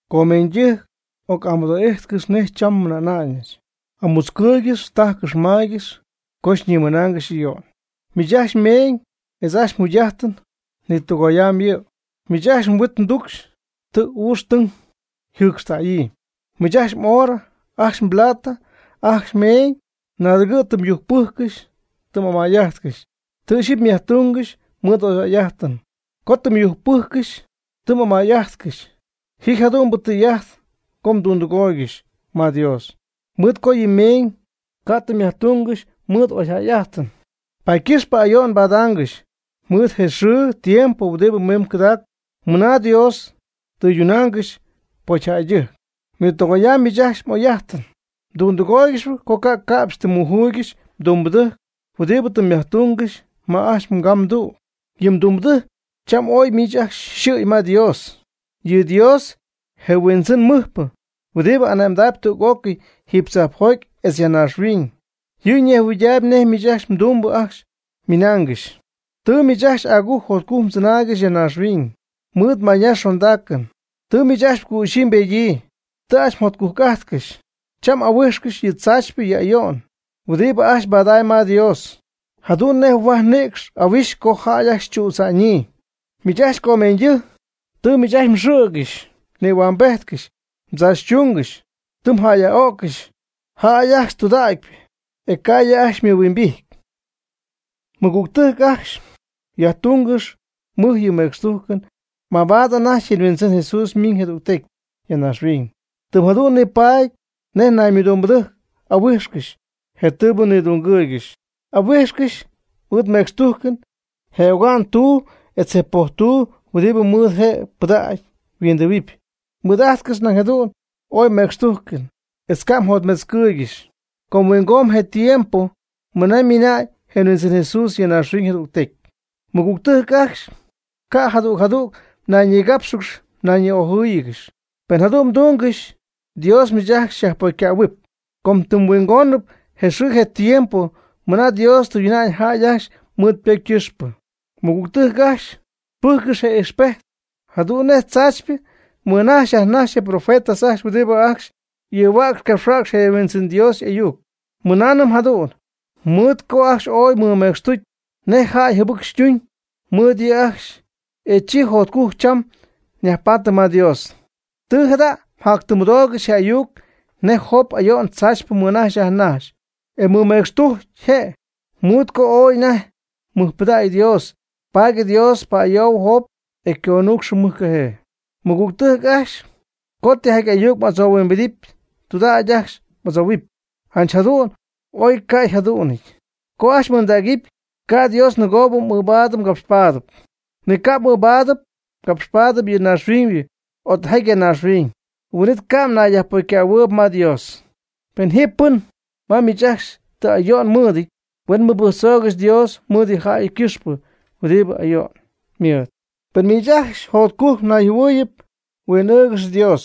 Comeeñydɨjc, oc'amɨdoo'ijtcɨx nej cham nmɨna'ñɨch. Amutzcɨɨygɨx, tajcɨx maygɨx co xyñiminaangɨxy ayo'n. Miich ajcxy mmeeñ etz ajcxy mjugy'ajt ñitɨgoyamb yɨ', miich ajcxy mhuit mducxy tɨ uucxytɨng yjɨcxtäyii. Miich ajcxy m'oorɨ, ajcxy mplata, ajcxy mmeeñ naadɨgɨ' tɨ myujpɨjccɨxy tɨ m'amay'ajtcɨxy. Tɨ ixyipy myajtungɨxy mɨɨd oyjäy'ajtɨn. Co tɨ myujcpɨjccɨxy tɨ m'amay'ajtcɨxy ji jadu'n je tɨy'ajt co mdundɨgooygɨxy ma Dios. Mɨɨd co yɨ mmeeñ ca' tɨ myajtungɨxy mɨɨd oyjäy'ajtɨn, paady ycɨxpɨ ayo'n mbadaangɨxy mɨɨd je xɨɨ tiempo huɨdibɨ mimb cɨdacp, mɨna Dios tɨydunaangɨxy pocyjäydɨjc. Nitɨgoyamb miich ajcxy m'oy'ajtɨn. Mdundɨgooygɨxyp co ca' ca'pxy tɨ mmujuuygɨxy mdumbɨdɨjc huɨdibɨ tɨ myajtungɨxy ma ajcxy mgamdu'. Yɨ mdumbɨdɨjc cham ooy miich ajcxy xɨ̈y ma Dios. Yɨ Dios, je Huindzɨn mɨjpɨ, huɨdi ane'mdaayb tüc'ócɨy jiiby tzajpjoty etz ya naaxhuiñ, yɨ' ñejhuɨydaayb nej miich mdumbɨ ajcxy ymɨnaangɨxy. Tɨ miich ajcxy agujc jotcujc mdzɨnaaygɨxy ya naaxhuiñ mɨɨd mayñax xondaacɨn. Tɨ miich ajcxy mgüxyii mbedyii, tɨ ajcxy mjotcujc'ajtcɨxy. Cham m'ahuijxcɨxyp yɨ tzaachypɨ yɨ ayo'n huɨdibɨ ajcxy mbadamyb ma Dios, jadu'n nej huaj nïcxpɨ ahuixy co jäy ajcxy chüdza'ñyii. Miich ajcxy comeeñyjäydɨjc tɨ miich ajcxy mxɨ̈gɨxy mnïhuambejtcɨxy, mdzaachytungɨxy tɨ myaj'öccɨxy jäy ajcxy tudägypɨ, e ca' yɨ' ajcxy xymɨhuimbijty. Mɨgügtɨjc ajcxy, yajtungɨxy mɨj yɨ mecxtujcɨn mabaad anajty je Huindzɨn Jesús ymiñ jadügtecy ya naaxhuiñ. Tɨm jadu'n nipaady nej naymɨdumbɨdɨjc ahuijxcɨxy je tɨɨbɨ nidungɨɨygɨxy, ahuijxcɨxy mɨɨd mecxtujcɨn je oga'n tuu etz je poj tuu huɨdi mɨɨd je' ypɨdägy yhuindɨhuɨpy. Mɨɨd'ajtcɨx nañ jadu'n ooy mecxtujcɨn, etz ca' mjotmetzcɨɨygɨxy, com huingomb je tiempo mɨna ymiina'ñ je Huɨndzɨn Jesús ya naaxhuiñ jadügtecy. Mɨgügtɨjc ajcxy, ca' jadüg jadüg mnayñigápxɨgɨxy nayñi'ojɨ́ɨyɨgɨxy. Pen jadu'n mdungɨxy Dios miich ajcxy xyajpocycähuɨpy, com tɨm huingonɨp je xɨɨ je tiempo mɨna Dios tɨyduna'ñ jäy ajcxy mɨɨd ypocy ycɨxpɨ. Mɨgügtɨjc ajcxy, pɨjccɨx je ijxpejt jadu'n nej tzaachypɨ mɨnajxy yajnajxy je profetas ajcxy huɨdibɨ ajcxy ɨɨhuäcxp capxhuäcxp je Huindzɨn Dios y'ayuc. Mɨnaanɨm jadu'n, mɨɨd co ajcxy ooy mɨmecxtucy nej jäy jɨbɨc ytuuñ mɨɨd yɨ' ajcxy, e chi jotcujc cham yajpaady ma Dios. Tɨ jada' mjatymɨdoogɨxy je ayuc nej Job ayo'n tzaachypɨ mɨnajxy yajnajxy, e ymɨmecxtujc je'. Mɨɨd co ooy anajty mɨjpɨdägy Dios, paady Dios pa'ayoy Job, e conuucx mɨjcajee. Mɨgügtɨjc ajcxy, co tijaty ayuc m'adzohuimbidɨpy, tɨydudägy ajcxy m'adzohuɨpy: “Janch jadu'n o ca' yjadu'nɨty”, ca' ajcxy m'ɨɨndägɨpy. Ca' Dios nɨgoo m'ɨɨbaadɨpy mgapxpaadɨpy. Ni ca' m'ɨɨbaadɨpy mgapxpaadɨpy yɨ naaxhuiñybɨ o tijaty ya naaxhuiñ. Huɨn'it ca' mnayyajpocycähuɨɨyb ma Dios. Pen ji pɨn ma miich ajcxy ti ayo'n mɨɨdɨty, huen mɨbɨjctzoogɨxy Dios mɨɨd yɨ jäy ycɨxpɨ huɨdibɨ ayo'n mɨɨd. Pen miich ajcxy jotcujc nayjɨhuɨɨyɨp, huen huin'ɨɨgɨxy Dios.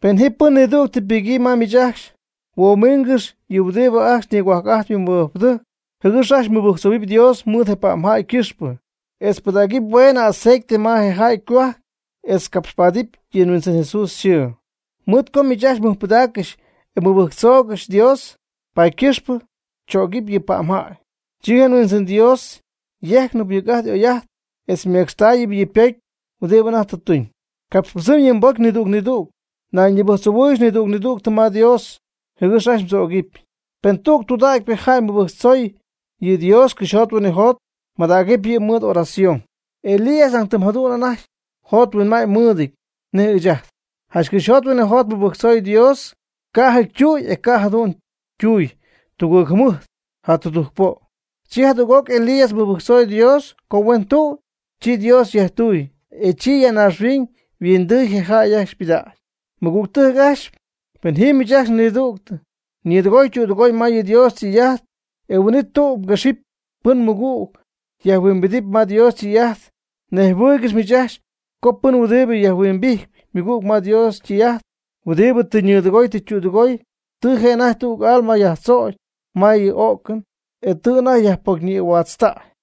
Pen ji pɨn nidügtɨ ypɨgyii ma miich ajcxy, huoomiingɨx yɨ' huɨdibɨ ajcxy nigohuajc'ajtp yɨ mɨbɨjcpɨdɨjc, jɨgɨx ajcxy mɨbɨjctzoohuɨpy Dios mɨɨd je pa'mjäy ycɨxpɨ, etz pɨdägɨpy hueenɨ aceite ma je jäy ycohuajc etz capxpaadɨpy yɨ Huindzɨn Jesús yxɨɨ. Mɨɨd co miich ajcxy mmɨjpɨdaaccɨxy e mmɨbɨjctzoogɨxy Dios, paady ycɨxpɨ tzögɨpy yɨ pa'mjäy. Chi je Huindzɨn Dios yejcnɨp mɨc'ajt oy'ajt, etz ymecxtaayɨpy yɨ' ypocy huɨdibɨ anajty tɨ tuñ. Capxpɨdzɨm yɨ mbocy nidüg nidüg. Ñayñibɨjctzoohuɨ́ɨyɨgɨx nidüg nidüg ma Dios, jɨgɨx ajcxy mdzögɨpy. Pen tüg tudägypɨ jäy ymɨbɨjctzooyb yɨ Dios cɨxyjot huinɨjot, madägɨpy yɨ' mɨɨd y'oración. Elías nañ tɨm jadu'n anajty yjothuinma'ñ mɨɨdɨty nej ɨɨch ajt. Janch cɨxyjot huinɨjot mɨbɨjctzooy Dios ca'jɨty ytüy, e ca' je' jadu'n ytuuy tugɨɨg jɨmɨjt ja tudujc po'. Chi jadüg'oc Elías mɨbɨjctzoy Dios co huen tüy, chi Dios yajtuuy, e chi ya naaxhuiñ yhuindɨɨy je jäy ajcxy ypɨdägy. Mɨgügtɨjc ajcxy, pen ji miich ajcxy nidüg ñɨɨdɨgoy ytüdɨgoy ma yɨ Dios ytɨy'ajt, e huin'it tüg quëxɨ̈gɨpy pɨn ymɨgüg yajhuimbidɨpy ma Dios ytɨy'ajt, nejhuɨɨygɨx miich ajcxy co pɨn huɨdi yajhuimbijtp ymɨgüg ma Dios ytɨy'ajt, huɨdibɨ tɨ ñɨɨdɨgooy tɨ ytüdɨgooy, tɨ je' anajty tüg alma yajtzögy ma yɨ o'cɨn, e tɨ anajty yajpocyñïhuaatztäy.